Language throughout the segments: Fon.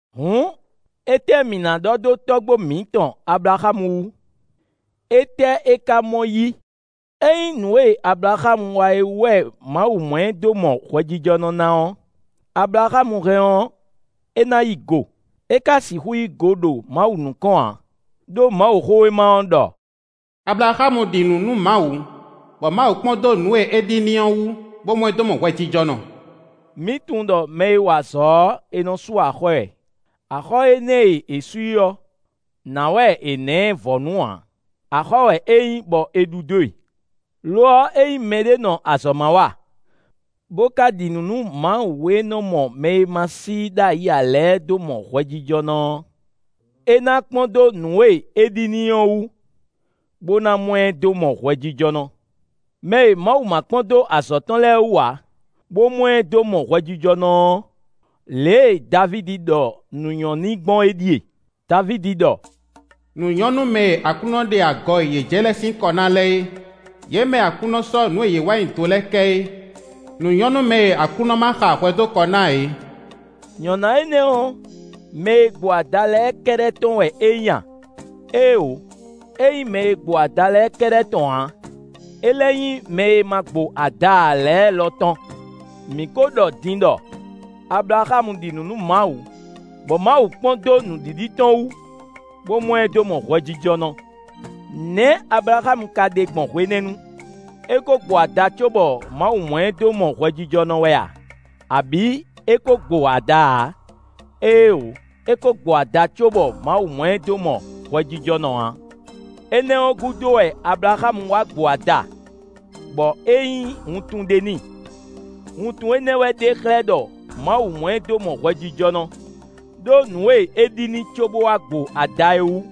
Hǔn étɛ́ mǐ ná ɖɔ dó tɔ́gbó mǐtɔn Ablaxámu wú? Étɛ́ é ka mɔ yí? Ényí nǔ e Ablaxámu wa é wú wɛ Mawu mɔ ɛ dó mɔ hwɛjijɔnɔ ná ɔ́, Ablaxámu hɛn ɔ́, é ná yí go; é ka sixú yí go ɖo Mawu nukɔn ǎ. Đó Mawuxówéma ɔ́ ɖɔ: “Ablaxámu ɖi nǔ nú Mawu, bɔ Mawu kpɔ́n dó nǔ e é ɖi n'i ɔ́ wú, bó mɔ ɛ dó mɔ hwɛjijɔnɔ.” Mǐ tunwun ɖɔ mɛ e wa azɔ̌ ɔ́, è nɔ sú axɔ́ ɛ; axɔ́ énɛ́ e è sú i ɔ́, nǎ wɛ è nǎ ɛ vɔ̌nu ǎ; axɔ́ wɛ é nyí bɔ è ɖu dó e. Lo ɔ́, ényí mɛɖé nɔ azɔ̌ ma wa, bó ka ɖi nǔ nú Mawu e nɔ́ mɔ mɛ e ma nɔ sí i ɖ'ayǐ ǎ lɛ́ɛ dó mɔ hwɛjijɔnɔ ɔ́, é ná kpɔ́n dó nǔ e é ɖi n'i ɔ́ wú, bó ná mɔ ɛ dó mɔ hwɛjijɔnɔ. Mɛ e Mawu ma kpɔ́n dó azɔ̌ tɔn lɛ́ɛ wú ǎ, bó mɔ ɛ dó mɔ hwɛjijɔnɔ ɔ́, lě e Davídi ɖɔ nǔ nyɔ́ n'i gbɔn é ɖíe; Davídi ɖɔ: “Nǔ nyɔ́ nú mɛ e Aklúnɔ ɖe agɔ e yě jɛ lɛ́ɛ sín kɔ ná lɛ́ɛ é; yě mɛ e Aklúnɔ sɔ́ nǔ e yě wa nyi do lɛ́ɛ kɛ é. Nǔ nyɔ́ nú mɛ e Aklúnɔ ma xa hwɛ dó kɔ ná ǎ é.” Nyɔ̌ná énɛ́ ɔ́, mɛ e gbo ada lɛ́ɛ kɛ́ɖɛ́ tɔn wɛ é nyí a? Éeǒ! É nyí mɛ e gbo ada lɛ́ɛ kɛ́ɖɛ́ tɔn ǎ. É lɛ́ nyí mɛ e ma gbo ada ǎ lɛ́ɛ lɔ tɔn. Mǐ ko ɖɔ din ɖɔ: “Ablaxámu ɖi nǔ nú Mawu, bɔ Mawu kpɔ́n dó nǔɖiɖi tɔn wú, bó mɔ ɛ dó mɔ hwɛjijɔnɔ.” Nɛ̌ Ablaxámu ka ɖe gbɔn hwenɛ́nu? É kó gbo ada cóbɔ Mawu mɔ ɛ dó mɔ hwɛjijɔnɔ wɛ a, abǐ é kó gbo ada ǎ? Éeǒ! É kó gbo ada cóbɔ Mawu mɔ ɛ dó mɔ hwɛjijɔnɔ ǎ. Énɛ́ ɔ́ gúdo wɛ Ablaxámu wá gbó ada, bɔ é nyí wuntun ɖé n'i. Wuntun énɛ́ wɛ ɖe xlɛ́ ɖɔ Mawu mɔ ɛ dó mɔ hwɛjijɔnɔ, ɖó nǔ e é ɖi n'i cóbó wá gbo ada é wú.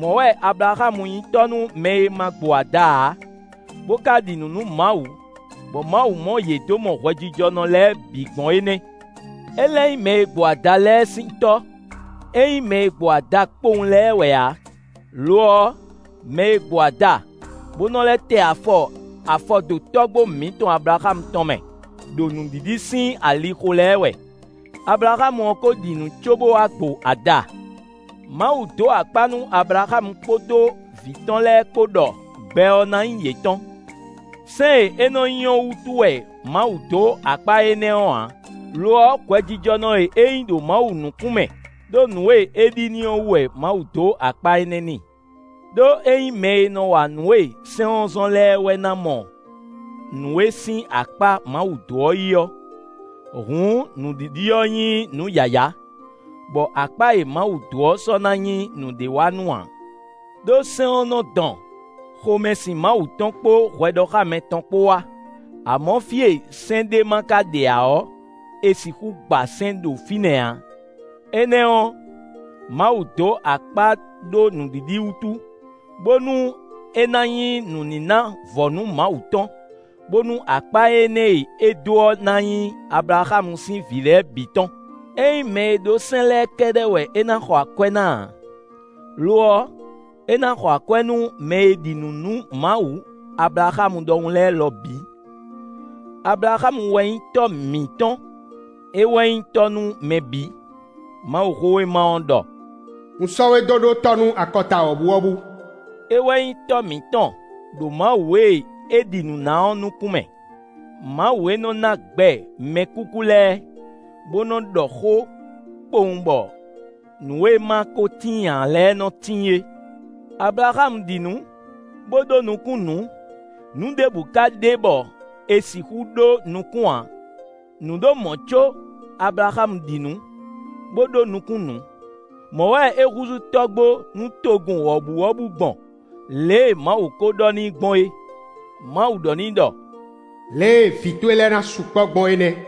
Mɔ̌ wɛ Ablaxámu nyí tɔ́ nú mɛ e ma gbo ada ǎ, bó ka ɖi nǔ nú Mawu, bɔ Mawu mɔ yě dó mɔ hwɛjijɔnɔ lɛ́ɛ bǐ gbɔn é nɛ́. É lɛ́ nyí mɛ e gbo ada lɛ́ɛ sín tɔ́; é nyí mɛ e gbo ada kpowun lɛ́ɛ wɛ ǎ; lo ɔ́, mɛ e gbo ada, bó nɔ lɛ́ tɛ afɔ afɔdo tɔ́gbó mǐtɔn Ablaxámu tɔn mɛ, ɖo nǔɖiɖi sín alixo lɛ́ɛ wɛ: Ablaxámu ɔ́ kó ɖi nǔ cóbó wá gbo ada. Mawu dó akpá nú Ablaxámu kpódó vǐ tɔn lɛ́ɛ kpó ɖɔ gbɛ ɔ́ ná nyí yětɔn. Sɛ́n e é nɔ nyi ɔ́ wútu wɛ Mawu dó akpá énɛ́ ɔ́ ǎ; lo ɔ́ hwɛjijɔnɔ e é nyí ɖo Mawu nukún mɛ ɖó nǔ e é ɖi n'i ɔ́ wú wɛ Mawu dó akpá énɛ́ n'i. Đó é nyí mɛ e nɔ wa nǔ e sɛ́n ɔ́ zɔ́n lɛ́ɛ wɛ ná mɔ nǔ e sín akpá Mawu dó ɔ́ yí ɔ́, hǔn nǔɖiɖi ɔ́ nyí nǔ yǎyá, bɔ akpá e Mawu dó ɔ́ sɔ́ na nyí nǔɖé wa nú ǎ. Đó sɛ́n ɔ́ nɔ dɔn xomɛsin Mawu tɔn kpó hwɛɖɔxámɛ tɔn kpó wá; amɔ̌ fí e sɛ́n ɖé ma ka ɖe ǎ ɔ́, è sixú gba sɛ́n ɖo fínɛ́ ǎ. Énɛ́ ɔ́, Mawu dó akpá ɖó nǔɖiɖi wútu, bónú é ná nyí nǔníná vɔ̌nu Mawu tɔn, bónú akpá énɛ́ e é dó ɔ́ na nyí Ablaxámu sín vǐ lɛ́ɛ bǐ tɔn. É nyí mɛ e ɖó sɛ́n lɛ́ɛ kɛ́ɖɛ́ wɛ é ná xɔ akwɛ́ ná ǎ; lo ɔ́, é ná xɔ akwɛ́ nú mɛ e ɖi nǔ nú Mawu Ablaxámu ɖɔhun lɛ́ɛ lɔ bǐ. Ablaxámu wɛ nyí tɔ́ mǐtɔn; é wɛ nyí tɔ́ nú mɛ bǐ. Mawuxówéma ɔ́ ɖɔ: “Un sɔ́ we dó ɖó tɔ́ nú akɔta wɔ̌buwɔ́bú.” É wɛ nyí tɔ́ mǐtɔn ɖo Mawu e é ɖi nǔ na ɔ́ nukún mɛ; Mawu e nɔ ná gbɛ mɛkúkú lɛ́ɛ, bó nɔ ɖɔ xó kpowun bɔ nǔ e ma ko tíin ǎ lɛ́ɛ nɔ tíin é. Ablaxámu ɖi nǔ, bó ɖó nukún nǔ; nǔ ɖěbǔ ka ɖe bɔ è sixú ɖó nukún ǎ; nǔ ɖo mɔ̌ có Ablaxámu ɖi nǔ, bó ɖó nukún nǔ. Mɔ̌ wɛ é húzú tɔ́gbó nú togun wɔ̌buwɔ́bú gbɔn, lě e Mawu ko ɖɔ n'i gbɔn é; Mawu ɖɔ n'i ɖɔ: “Lě e vǐ towe lɛ́ɛ ná sukpɔ́ gbɔn é nɛ́.”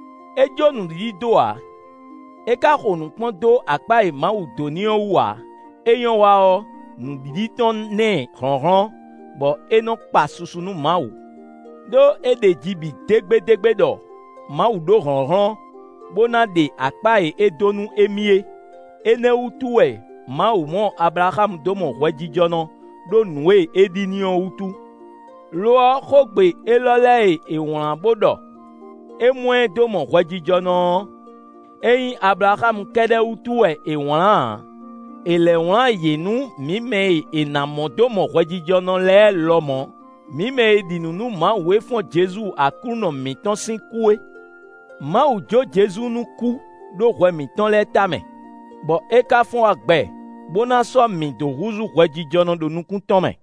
É jó nǔɖiɖi dó ǎ; é ka xo nǔ kpɔ́n dó akpá e Mawu dó n'i ɔ́ wú ǎ; é nyɔ́ wa ɔ́, nǔɖiɖi tɔn ná ɛ hlɔ̌nhlɔ́n, bɔ é nɔ kpa susu nú Mawu. Đó é ɖeji bǐ dégbédégbé ɖɔ Mawu ɖó hlɔ̌nhlɔ́n, bó ná ɖe akpá e é dó nú émí é. Énɛ́ wútu wɛ Mawu mɔ Ablaxámu dó mɔ hwɛjijɔnɔ ɖó nǔ e é ɖi n'i ɔ́ wútu. Lo ɔ́, xógbe élɔ́ lɛ́ɛ e è wlán bó ɖɔ: “É mɔ ɛ dó mɔ hwɛjijɔnɔ” ɔ́, é nyí Ablaxámu kɛ́ɖɛ́ wútu wɛ è wlán ǎ. È lɛ́ wlán yě nú mǐ mɛ e è ná mɔ dó mɔ hwɛjijɔnɔ lɛ́ɛ lɔmɔ̌; mǐ mɛ e ɖi nǔ nú Mawu e fɔ́n Jezu Aklúnɔ mǐtɔn sín kú é. Mawu jǒ Jezu nú kú ɖó hwɛ mǐtɔn lɛ́ɛ tamɛ, bɔ é ka fɔ́n wá gbɛ, bó ná sɔ́ mǐ dó húzú hwɛjijɔnɔ ɖo nukún tɔn mɛ.